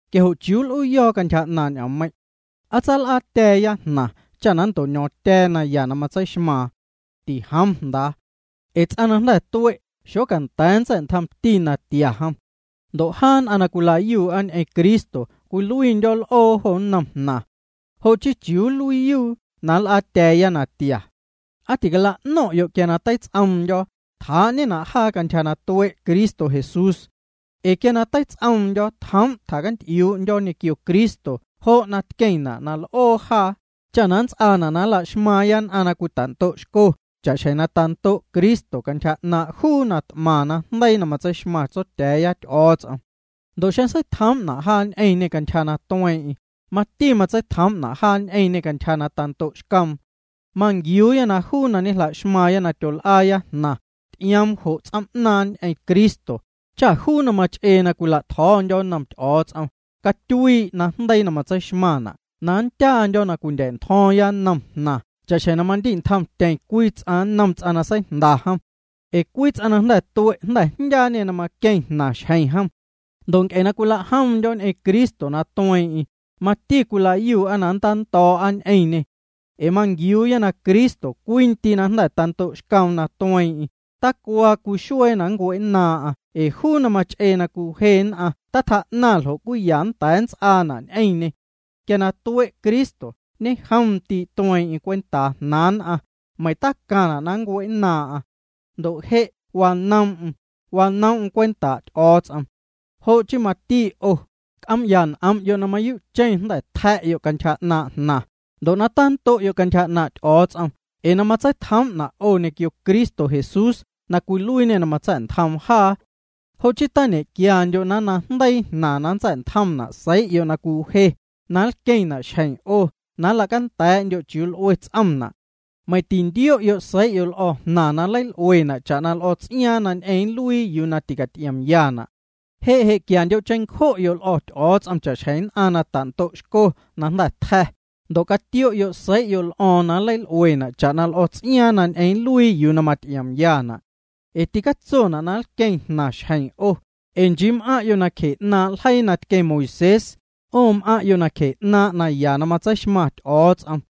¿Quia jo' ¿chiuu nl'uuyo̱o̱ cantyja 'naaⁿ' ñ'oommeiⁿ'? ¿Aa tsal'aatya̱a̱ya jnaⁿ cha na nnto'ño̱o̱ⁿtya̱a̱ naya na matseixmaaⁿ? Tijoom jndaa. Ee juu ts'aⁿ na jnda̱ tue' xocanda̱a̱ nntsa̱'ntjomti natia jom. Ndo' jaa nn'aⁿ na cwila'yuu'a ñ'eⁿ Cristo cwiluiindyo̱ l'oo jo nnom jnaⁿ. Jo' chii ¿chiuu nluiiyuu na nl'aatya̱a̱ya natia? ¿Aa ticala'no̱ⁿ'yo' quia na teits'oomndyo̱, tjaa'ñena' jaa cantyja na tue' Cristo Jesús? Ee quia na teits'oomndyo̱ tjoom' tjacanty'iuu'ndyo̱ ñequio Cristo jo' na tqueⁿna' na l'oo jaa, cha na nnts'aana' na la'xmaaⁿya nn'aⁿ na cwita'ndo'xco cha'xjeⁿ na tando'xco Cristo cantyja 'naaⁿ' juu na t'maⁿ najndeii na matseixmaⁿ Tsotya̱a̱ya Ty'o̱o̱ts'om. Ndo' xeⁿ seitjoom'na jaa ñ'eⁿñê cantyja na tueeⁿ'eⁿ, mati matseitjoom'na' jaa ñ'eⁿñê cantyja na tando'xcoom. Manquiuuya juu na ñejla'xmaaⁿya na tyol'aaya jnaⁿ, ty'ioomna' jo' ts'oom'naaⁿ ñ'eⁿ Cristo, cha juu na mach'eena' na cwila'tjo̱o̱ndyo̱ nnom Ty'o̱o̱ts'om, catyuii' najndeii na matseixmaⁿna' na nndyaandyo̱ na cwindya̱'ntjo̱o̱ⁿya nnom jnaⁿ cha'xjeⁿ mandi'ntjomtyeⁿ cwii ts'aⁿ nnom ts'aⁿ na seijnda jom. Ee ts'aⁿ na jnda̱ tue' jnda̱ jndyaañê na maqueⁿ jnaⁿ xjeⁿ jom. Ndo' nc'e na cwila'jomndyo̱ ñ'eⁿ Cristo na tueeⁿ'eⁿ, mati cwila'yuu'a na nntando̱o̱'a ñ'eⁿñê. Ee manquiuuya na Cristo cwii ndii' na jnda̱ tando'xcoom na tueeⁿ'eⁿ, tacuaa cwii xuee na nncue'nnaaⁿ'aⁿ ee juu na mach'ee na cwiwje nn'aⁿ tatjaa'naⁿ ljo' cwiya nnda̱a̱ nnts'aana' ñ'eⁿñê. Quia na tue' Cristo, ñejom ndii' tueeⁿ'eⁿ cwentaa jnaaⁿ nn'aⁿ, meiⁿ tacaⁿna' na cue'nnaaⁿ'aⁿ. Ndo' je' na wanoom'm, wanoom'm cwentaa' Ty'o̱o̱ts'om. Jo' chii mati 'o, c'oom'ya n'om'yo' na mayuu'cheⁿ na jnda̱ tja̱'yo' cantyja 'naaⁿ' jnaⁿ, ndo' na tando'yo' cantyja 'naaⁿ' Ty'o̱o̱ts'om ee na matseitjoom'na' 'o ñequio Cristo Jesús na cwiluiiñê na matsa̱'ntjoom jaa. Jo' chii tañequiandyo' na nnaⁿjndeii jnaⁿ na nntsa̱'ntjomna' seii'yo' na cwiwje, na nlqueⁿna' xjeⁿ 'o na nla'canda̱a̱'ndyo' chiuu l'ue ts'omna'. Meiⁿ tintio'yo' seii'yo' l'o̱ jnaⁿ, na nleil'uena' cha'na l'o̱ts'iaaⁿ na ñ'eⁿ nluii yuu na ticaty'iomyana'. Je' je' quiandyo' cheⁿncjo'yo' l'o̱ Ty'o̱o̱ts'om cha'xjeⁿ nn'aⁿ na tando'xco na tja̱, ndo' catio'yo' seii'yo' l'o̱o̱ⁿ na nleil'uena' cha'na l'o̱ts'iaaⁿ na ñ'eⁿ nluii yuu na maty'iomyana'. Ee ticatsona' na nlqueⁿ jnaⁿ xjeⁿ 'o, ee nchii m'aⁿ'yo' nacje 'naaⁿ' ljeii na tqueⁿ Moisés, 'o m'aⁿ'yo' nacje 'naaⁿ' naya na matseixmaⁿ Ty'o̱o̱ts'om.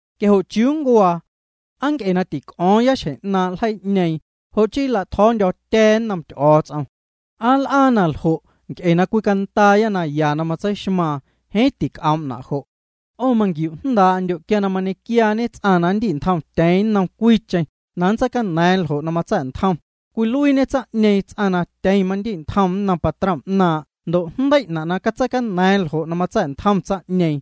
Quia jo' ¿chiuu nncuaa? ¿Aa nc'e na tic'o̱o̱ⁿya xjeⁿ 'naaⁿ' ljeii'ñeeⁿ, jo' chii nla'tjo̱o̱ndyo̱tya̱a̱ nnom Ty'o̱o̱ts'om? ¿Aa nl'aa na ljo' nc'e na cwicandaaya naya na matseixmaaⁿ? Jeeⁿ tic'oom'na' jo'. 'O manquiujndaa'ndyo' quia mañequiaañe ts'aⁿ na nndi'ntjomtyeeⁿ nnom cwiicheⁿ na nntseicana̱a̱ⁿ ljo' na matsa̱'ntjom, cwiluiiñe tsaⁿ'ñeeⁿ ts'aⁿ na tyeⁿ mandi'ntjom nnom patrom 'naaⁿ' ndo' jndei'na' na catseicana̱a̱ⁿ ljo' na matsa̱'ntjom tsaⁿ'ñeeⁿ.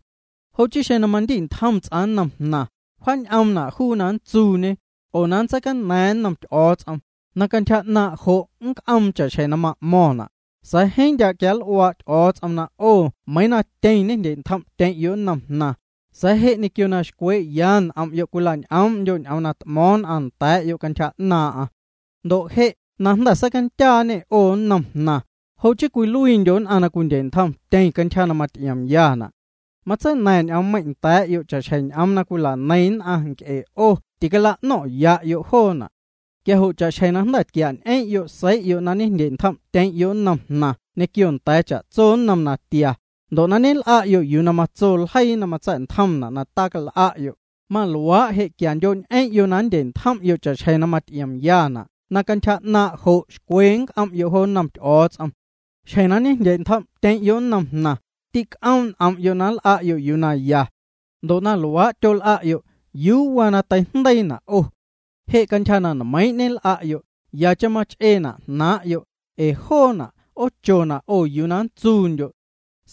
Jo' chii xeⁿ mandi'ntjom ts'aⁿ nnom jnaⁿ, wjaan'omna' juu na nntsuuñe, oo aa nntseicana̱a̱ⁿ nnom Ty'o̱o̱ts'om, na cantyja 'naaⁿ' jo' nnc'oom cha'xjeⁿ na ma'mo̱ⁿna'. Sa̱a̱ jeeⁿ ndya' quianl'uaa' Ty'o̱o̱ts'om, na 'o meiiⁿ na tyeⁿ ñejndye'ntjom'yo' nnom jnaⁿ, sa̱a̱ je' ñequio na xcwee'ya n'om'yo' cwila'ñ'oom'ndyo' ñ'oom na t'mo̱o̱ⁿ nn'aⁿ nda̱a̱'yo' cantyja 'naaⁿ'aⁿ. Ndo' je' na jnda̱ seicandyaañê 'o nnom jnaⁿ, jo' chii cwiluiindyo' nn'aⁿ na cwindye'ntjomtyeⁿ cantyja na maty'iomyana'. Matseina̱ⁿ ñ'oommeiⁿ' nda̱a̱'yo' cha'xjeⁿ ñ'oom na cwila'neiⁿ nn'aⁿ nc'e 'o ticala'no̱ⁿ'ya'yo' joona'. Quia jo' cha'xjeⁿ na jnda̱ tquia'ñ'eⁿ'yo' seii'yo' na ñejndye'ntjom'tyeⁿ'yo' nnom jnaⁿ ñequio nda̱a̱ cha'tso nnom natia, ndo' na ñel'a'yo' yuu na matso ljeii na matsa̱'ntjomna' na tal'a'yo', maluaa' je' quiandyo'ñ'eⁿ'yo' na nndye'ntjom'yo' cha'xjeⁿ na maty'iomyana' na cantyja 'naaⁿ' jo' xcwe nc'om'yo' jo nnom Ty'o̱o̱ts'om. Xjeⁿ na ñejndye'ntjom'tyeⁿ'yo' nnom jnaⁿ, tîc'oom' n'om'yo' na nl'a'yo' yuu na ya. Ndo' na luaa' tyol'a'yo', ¿yuu waa na teijndeiina' 'o? Je' cantyja na nmeiiⁿ' ñel'a'yo', yacheⁿ mach'eena' jnaaⁿ'yo', ee joona' 'oochona' 'o na nntsuundyo'.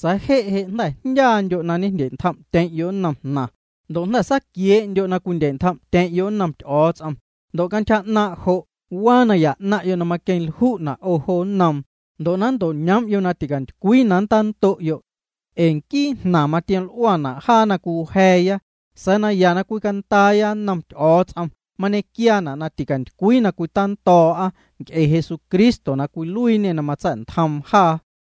Sa̱a̱ je' je' jnda̱ jndyaandyo' na ñejndye'ntjom'tyeⁿ'yo' nnom jnaⁿ, ndo' jnda̱ saaquiee'ndyo' na cwindye'ntjom'tyeⁿ'yo' nnom Ty'o̱o̱ts'om, ndo' cantyja 'naaⁿ' jo' waa naya 'naⁿ'yo' na maqueⁿlju'na' 'o jo nnoom, ndo' na nnto'ñoom'yo' na ticantycwii na nntando'yo'. Ee nquii jnaⁿ matioml'uana' jaa na cwiwja̱a̱ya, sa̱a̱ naya na cwicandaaya nnom Ty'o̱o̱ts'om mañequiaana' na ticantycwii na cwita'ndo̱'a nc'e Jesucristo na cwiluiiñê na matsa̱'ntjoom jaa.